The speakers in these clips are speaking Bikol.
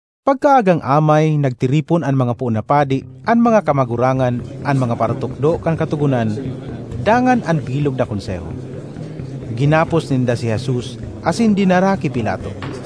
Pagkaagang amay nagtiripon an mga poon na padi, an mga kamagurangan, an mga paratukdo kan Katogonan dangan an bilog na Konseho. Ginapos ninda si Jesus asin dinara ki Pilato.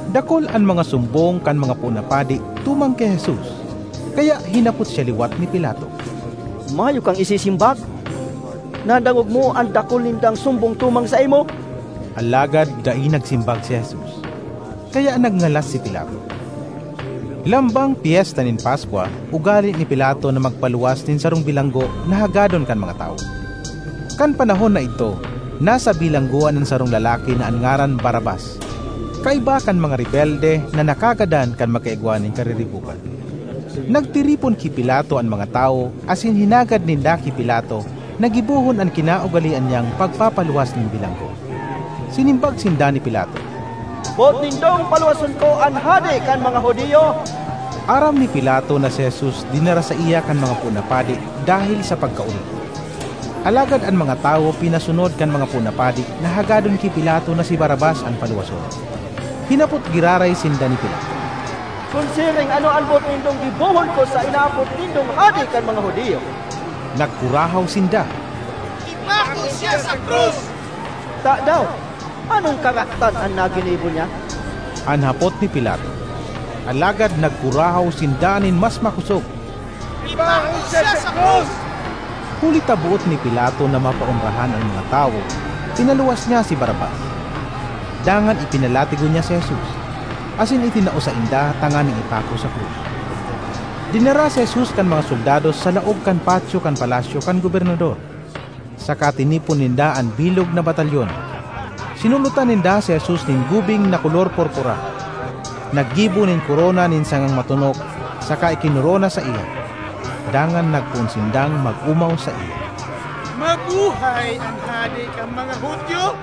Dakul an mga sumbong kan mga poon na padi tumang ki Jesus. Kaya hinapot siya liwat ni Pilato, “Mayo kang isisimbag? Nadangog mo an dakul nindang sumbong tumang saimo!” Alagad dai nagsimbag si Jesus, kaya nagngalas si Pilato. Lambang Pyesta nin Paskwa, ugale ni Pilato na magpaluwas nin sarong bilanggo na hagadon kan mga tawo. Kan panahon na idto nasa bilanggoan an sarong lalaki na an ngaran Barrabas kaiba kan mga rebelde na nakagadan kan magkaigwa nin kariribokan. Nagtiripon ki Pilato an mga tawo asin hinagad ninda ki Pilato na gibohon an kinaugalean niyang pagpapaluwas nin bilanggo. Sinimbag sinda ni Pilato, “Boot nindong paluwason ko an hade kan mga Judio?” Aram ni Pilato na si Jesus dinara saiya kan mga poon na padi dahel sa pagkaori. Alagad an mga tawo pinasunod kan mga poon na padi na hagadon ki Pilato na si Barrabas an paluwason. Hinapot giraray sinda ni Pilato, “Kun siring ano an boot nindong gibohon ko sa inaapod nindong hade kan mga Judio?” Nagkurahaw sinda, “Ipako siya sa krus!” ”Tadaw, anong karatan an naginibo niya?” an hapot ni Pilato. Alagad nagkurahaw sinda nin mas makosog, “Ipako siya sa krus!” Huli ta boot ni Pilato na mapaonrahan an mga tawo, pinaluwas niya si Barrabas. Dangan ipinalatigo niya si Jesus, asin itinao sainda tanganing ipako sa krus. Dinara si Jesus kan mga soldados sa laog kan patyo kan palasyo kan gobernador, saka tinipon ninda an bilog na batalyon. Sinulotan ninda si Jesus nin gubing na kolor purpura. Naggibo nin korona nin sangang matonok saka ikinorona saiya. Dangan nagpoon sindang mag-omaw saiya. “Mabuhay an Hade kan mga Judio!”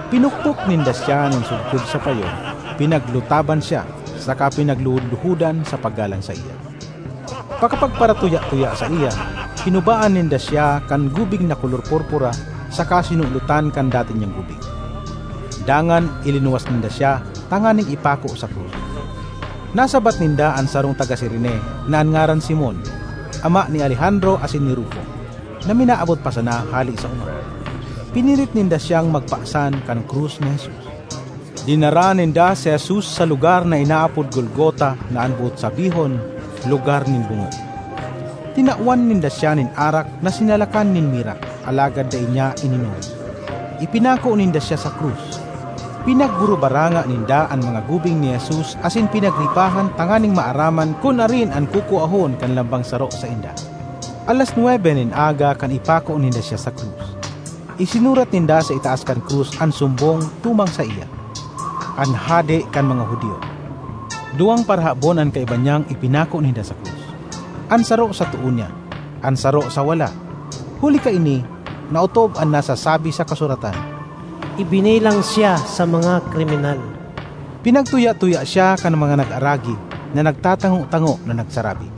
Pinukpok ninda siya nin sugkod sa payo, pinaglutaban siya, saka pinagluhod-luhodan sa paggalang saiya. Pakapagparatuya-tuya saiya, hinubaan ninda siya kan gubing na kolor purpura saka sinulotan kan dati niyang gubing. Dangan ilinuwas ninda siya tanganing ipako sa krus. Nasabat ninda an sarong taga Cirene na an ngaran Simon—ama ni Alejandro asin ni Rufo—na minaabot pa sana hale sa oma. Pinirit ninda siyang magpasan kan krus ni Jesus. Dinara ninda si Jesus sa lugar na inaapod Golgota na an boot sabihon, “Lugar nin Bungo.” Tinawan ninda siya nin arak na sinalakan nin mira, alagad dai niya ininom. Ipinako ninda siya sa krus. Pinagburubaranga ninda an mga gubing ni Jesus asin pinagripahan tanganing maaraman kun arin an kukuahon kan lambang saro sainda. Alas nwebe nin aga kan ipako ninda siya sa krus. Isinurat ninda sa itaas kan krus an sumbong tumang saiya, “An Hade kan mga Judio.” Duwang parahabon an kaiba niyang ipinako ninda sa krus, an saro sa too niya, an saro sa wala. Huli kaini, naotob an nasasabi sa Kasuratan: “Ibinilang siya sa mga kriminal.” Pinagtuya-tuya siya kan mga nag-aragi, na nagtatango-tango na nagsarabi,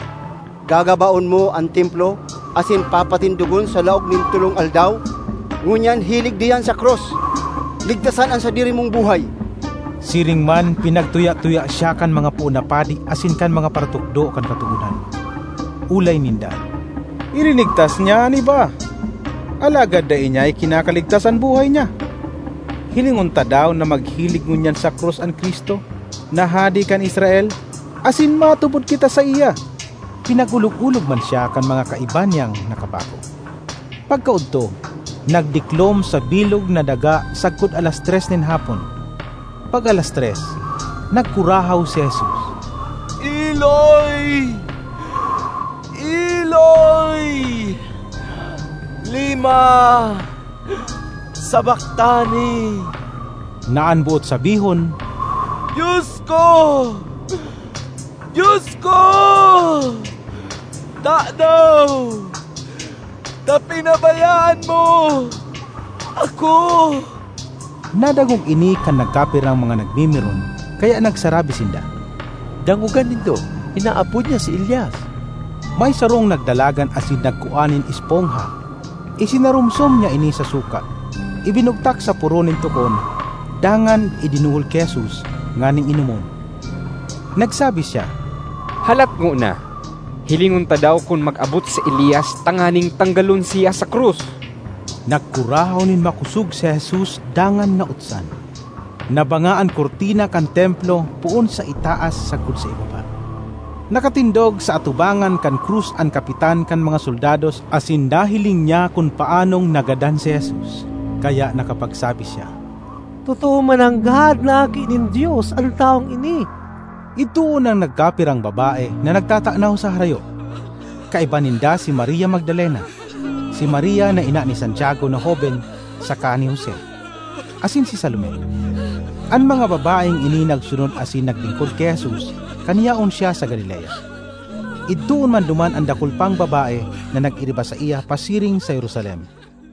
“Gagabaon mo an Templo asin papatindogon sa laog nin tolong aldaw! Ngunyan hilig diyan sa krus; ligtasan an sadiri mong buhay!” Siring man pinagtuya-tuya siya kan mga poon na padi asin kan mga paratukdo kan Katogonan. Olay ninda, “Ilinigtas niya an iba, alagad dai niya ikinakaligtas an buhay niya! Hilingon ta daw na maghilig ngunyan sa krus an Cristo, na hade kan Israel, asin matubod kita saiya!” Pinag-olog-olog man siya kan mga kaiba niyang nakapako. Pagkaodto, nagdiklom sa bilog na daga sagkod alas tres nin hapon. Pag alas tres, nagkurahaw si Jesus, “Eloi, Eloi, lema sabactani?” na an boot sabihon, “Dios ko, Dios ko, tadaw ta pinabayaan mo ako?” Nadangog ini kan nagkapirang mga nagmimiron, kaya nagsarabi sinda, “Dangoga nindo, inaapod niya si Elias!” May sarong nagdalagan asin nagkua nin espongha; isinaromsom niya ini sa suka, ibinugtak sa poro nin tukon dangan idinuhol ki Jesus nganing inomon. Nagsabi siya, “Halat ngona, hilingon ta daw kun mag-abot si Elias tanganing tanggalon siya sa krus!” Nagkurahaw nin makosog si Jesus dangan nautsan. Nabanga an kurtina kan Templo poon sa itaas sagkod sa ibaba. Nakatindog sa atubangan kan krus an kapitan kan mga soldados asin nahiling niya kun paanong nagadan si Jesus, kaya nakapagsabi siya, “Totoo mananggad na Aki nin Dios an tawong ini!” Idtoon an nagkapirang babae na nagtatanaw sa harayo. Kaiba ninda si Maria Magdalena, si Maria na ina ni Santiago na hoben saka ni Jose, asin si Salome. An mga babaeng ini nagsunod asin naglingkod ki Jesus kan yaon siya sa Galilea. Idtoon man duman an dakul pang babae na nag-iriba saiya pasiring sa Jerusalem.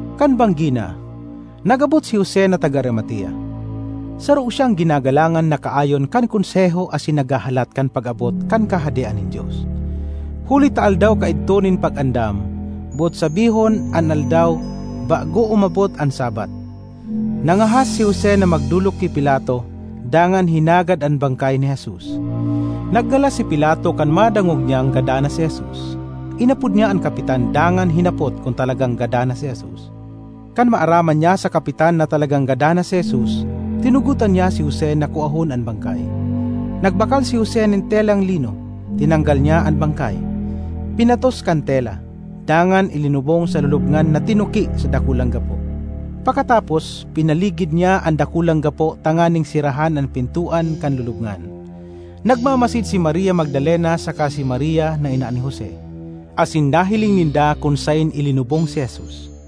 Kan banggi na, nag-abot si Jose na taga Arimatea. Saro siyang ginagalangan na kaayon kan Konseho asin naghahalat kan pag-abot kan Kahadean nin Dios. Huli ta aldaw kaidto nin Pag-andam (boot sabihon an aldaw bago umabot an Sabbath), nangahas si Jose na magdolok ki Pilato dangan hinagad an bangkay ni Jesus. Nagngalas si Pilato kan madangog niyang gadan na si Jesus; inapod niya an kapitan dangan hinapot kun talagang gadan na si Jesus. Kan maaraman niya sa kapitan na talagang gadan na si Jesus, tinugotan niya si Jose na kuahon an bangkay. Nagbakal si Jose nin telang lino, tinanggal niya an bangkay, pinatos kan tela, dangan ilinubong sa lulubngan na tinuki sa dakulang gapo. Pakatapos, pinaligid niya an dakulang gapo tanganing serahan an pintoan kan lulubngan. Nagmamasid si Maria Magdalena saka si Maria na ina ni Jose, asin nahiling ninda kun saen ilinubong si Jesus.